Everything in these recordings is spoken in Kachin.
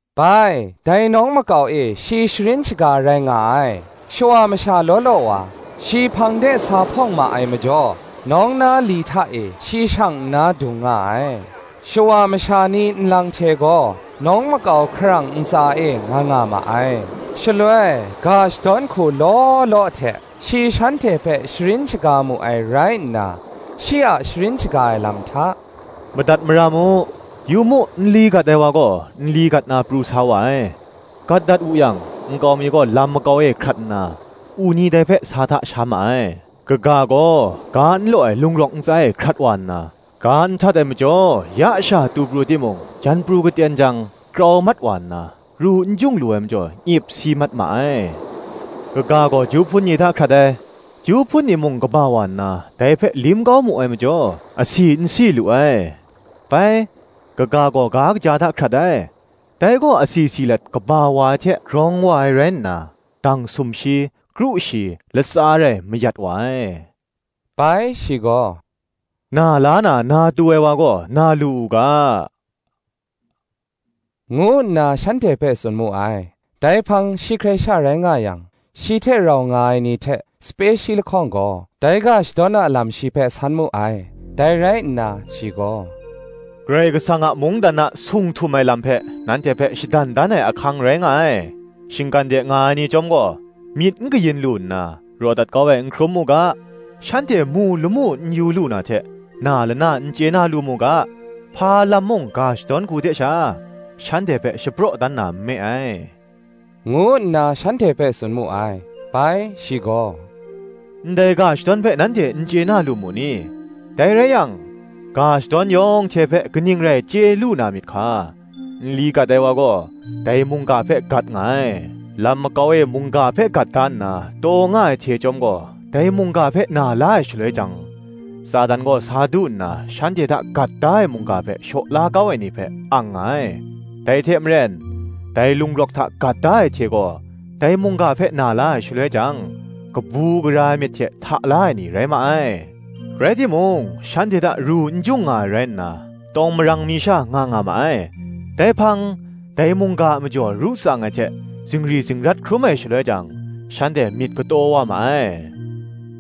Bai, dai nawng makau e shi sharin shaga rai nga ai. Shawa masha law law wa, shi hpang de sa hpawng ma ai majaw, nawng na li hta e shi shang nna dung nga ai: shawa masha ni nlang hte gaw, nawng makau hkarang ntsa e, nga nga ma ai. Shaloi ga shadawn hku law law hte, shi shanhte hpe sharin shaga mu ai rai nna, shi a sharin shaga ai lam hta, “Madat mara mu: yu mu, nli gat ai wa gaw, nli gat na pru sa wa ai. Gat dat wu yang, nkau mi gaw lam makau e hkrat nna, u ni dai hpe sa hta sha ma ai. Kaga gaw, ga n law ai lung rawk ntsa e hkrat wa nna, ga n htat ai majaw ya sha tu pru timung, jan pru katen jang, krau mat wa nna, ru n jung lu ai majaw nyip si mat ma ai. Kaga gaw, ju hpun ni hta hkrat ai; ju hpun ni mung kaba wa nna, dai hpe lim kau mu ai majaw, asi n si lu ai. Bai, kaga gaw ga kaja hta hkrat ai; dai gaw asi si let, kaba wa ai hte grawng wa ai rai nna, dang sumshi, kru shi, latsa rai, mayat wa ai.” Bai shi gaw, “Na la na, na tu ai wa gaw, na lu u ga,” ngu nna shanhte hpe tsun mu ai. Dai hpang shi hkrai sha rai nga yang, shi hte rau nga ai ni hte sape shi lahkawng gaw, dai ga shadawn a lam shi hpe san mu ai. Dai rai nna, shi gaw, “Karai Kasang a mungdan a sung htum ai lam hpe, nanhte hpe shadan dan ai ahkang rai nga ai: shinggan de nga ai ni chyawm gaw, Myit n kayin lu nna, raw dat kau ai n hkrum mu ga, Shanhte mu lamu n yu lu na hte, Na lana n chye na lu mu ga, hpa lam mung ga shadawn hku hte sha, shanhte hpe shapraw dan na nme ai,” ngu nna shanhte hpe tsun mu ai. Bai shi gaw, “Ndai ga shadawn hpe nanhte n chye na lu mu ni? dai rai yang, ga shadawn yawng hte hpe kaning rai chye lu na myit hka? Nli gat ai wa gaw, dai mungga hpe gat nga ai. Lam makau e mungga hpe gat da nna, taw nga ai hte chyawm gaw, dai mungga hpe na la ai shaloi jang, Satan gaw sa du nna, shanhte hta gat da ai mungga hpe shaw la kau ai ni hpe, ang nga ai. Dai hte maren, dai lung rawk hta gat da ai hte gaw, dai mungga hpe na la ai, shaloi jang, kabu gara ai myit hte hta la ai ni rai ma ai: rai timung, shanhte hta ru n jung nga ai rai nna, tawng marang mi sha nga nga ma ai: dai hpang, dai mungga a majaw ru tsang ai hte zingri zingrat hkrum ai shaloi jang, shanhte myit kataw wa ma ai.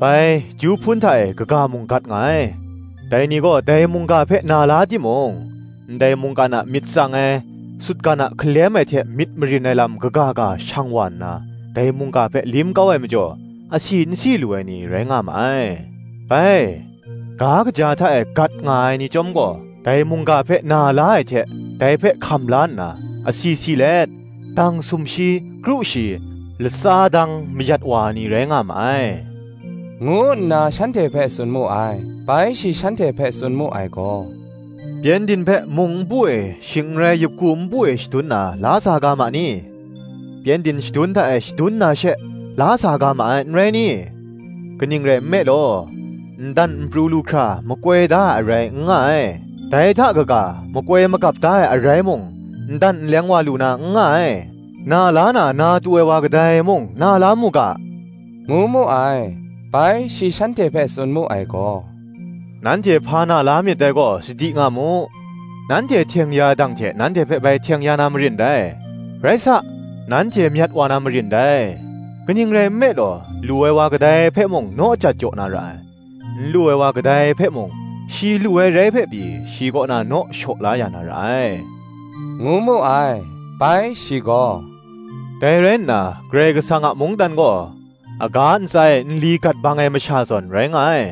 Bai, ju hpun hta e, kaga mung gat nga ai; dai ni gaw, dai mungga hpe na la timung, ndai mungkan a myit tsang ai, sutgan a hkalem ai hte myit marin ai lam kaga ga shang wa nna, dai mungga hpe lim kau ai majaw, asi n si lu ai ni, rai nga ma ai. Bai, ga kaja hta e gat nga ai ni chyawm gaw, dai mungga hpe na la ai hte dai hpe hkam la nna, asi si let, dang sumshi, kru shi, dang latsa, mayat wa ai ni rai nga ma ai,” ngu nna shanhte hpe tsun mu ai. Bai shi shanhte hpe tsun mu ai gaw, “Pyengdin hpe, mung npu e, shing n rai, yup ku npu e shadun na, la sa ga ma ni? pyengdin shadun hta e shadun na she, la sa ga ma ai, n rai ni? kaning rai nme law, n dan n pru lu hkra makoi da ai arai n nga ai; dai hta kaga, makoi magap da ai arai mung, n dan n leng wa lu na, n nga ai. Na la na, na tu ai wa kadai mung, na la mu ga,” ngu mu ai. Bai shi shanhte hpe tsun mu ai gaw, “Nanhte hpa na la myit dai gaw, sadi nga mu: nanhte hteng ya ai dang hte nanhte hpe bai hteng ya na marin dai: rai sa, nanhte myat wa na marin dai. Kaning rai nme law, lu ai wa kadai hpe mung, naw jat jaw na ra ai; n lu ai wa kadai hpe mung, shi lu ai rai hpe pyi, shi kaw na naw shaw la ya na ra ai,” ngu mu ai. Bai shi gaw, “Dai rai nna, Karai Kasang a mungdan gaw, aga ntsa e nli gat bang ai masha zawn, rai nga ai;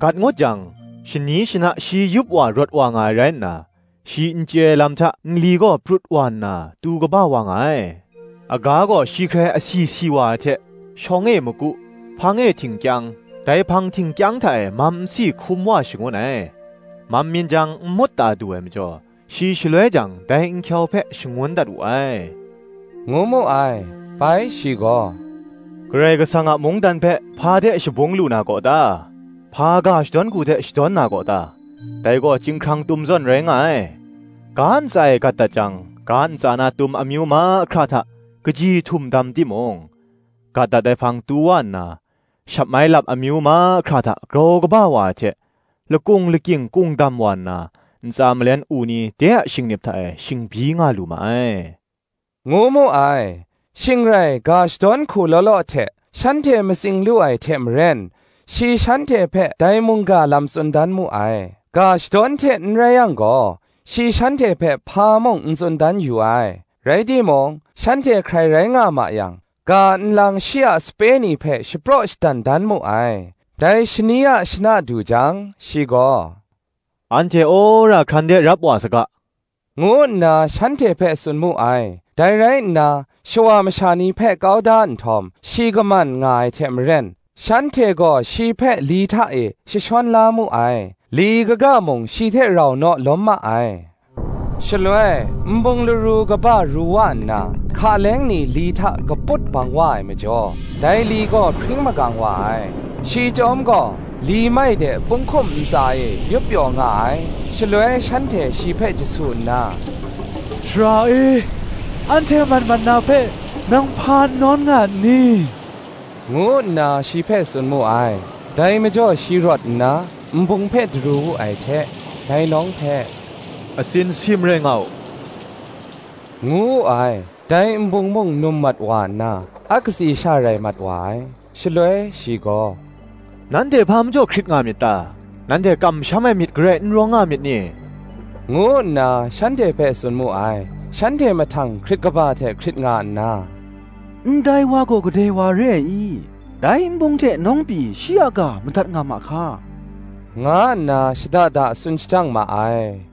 gat ngut jang, shani shana shi yup wa, rawt wa nga ai rai nna, shi n chye ai lam hta nli gaw prut wa nna, tu kaba wa nga ai. Aga gaw shi hkrai asi si wa ai hte, shawng e maku, hpang e htingkyang, dai hpang htingkyang hta e mam nsi hkum wa shangun ai. Mam myin jang nmut ta du ai majaw, shi shaloi jang, dai nhkyau hpe shangun dat wu ai,” ngu mu ai. Bai shi gaw, “Karai Kasang a mungdan hpe, hpa hte shabung lu na gaw ta? hpa ga shadawn hku hte shadawn na gaw ta? Dai gaw chyinghkrang tum zawn rai nga ai; ga ntsa e gat dat jang ga ntsa na tum amyu mahkra hta kaji htum dam timung, gat dat ai hpang, tu wa nna, shatmai lap amyu mahkra hta grau kaba wa ai hte, lakung lakying kung dam wa nna, ntsa malen u ni de a shingnip hta e shingbyi nga lu ma ai,” ngu mu ai. Shing rai ga shadawn hku law law hte, shanhte matsing lu ai hte maren, shi shanhte hpe dai mungga lam tsun dan mu ai. Ga shadawn hte n rai yang gaw, shi shanhte hpe hpa mung n tsun dan yu ai. Rai timung, shanhte hkrai rai nga ma yang, ga nlang shi a sape ni hpe shapraw shadan dan mu ai. Dai shani a shana du jang, shi gaw, “Anhte wora hkran de rap wa saga,” ngu nna shanhte hpe tsun mu ai. Dai rai nna, shawa masha ni hpe kau da nhtawm, shi kaman nga ai hte maren, shanhte gaw shi hpe li hta e jashawn la mu ai; li kaga mung shi hte rau naw lawm ma ai. Shaloi, nbung laru kaba ru wa nna, hka leng ni li hta kaput bang wa ai majaw, dai li gaw hpring magang wa ai. Shi chyawm gaw, li mai de punghkum ntsa e, yup pyaw nga ai: shaloi shanhte shi hpe jasu nna, “Sara e, anhte mat mat na hpe, nang hpa n nawn nga nni?” ngu nna shi hpe tsun mu ai. Dai majaw shi rawt nna, nbung hpe daru wu ai hte, dai nawng hpe, “Atsin sim rai nga u,” ngu wu ai. Dai nbung mung num mat wa nna, a katsi sha rai mat wa ai. Shaloi shi gaw, “Nanhte hpa majaw hkrit nga myit ta? Nanhte kamsham ai myit garai n rawng nga myit ni?” ngu nna shanhte hpe tsun mu ai. Shanhte mahtang hkrit kaba hte hkrit nga nna, “Ndai wa gaw kadai wa re ai i? dai nbung hte nawng pyi shi a ga madat nga ma hka?” nga nna shada da tsun shajang ma ai.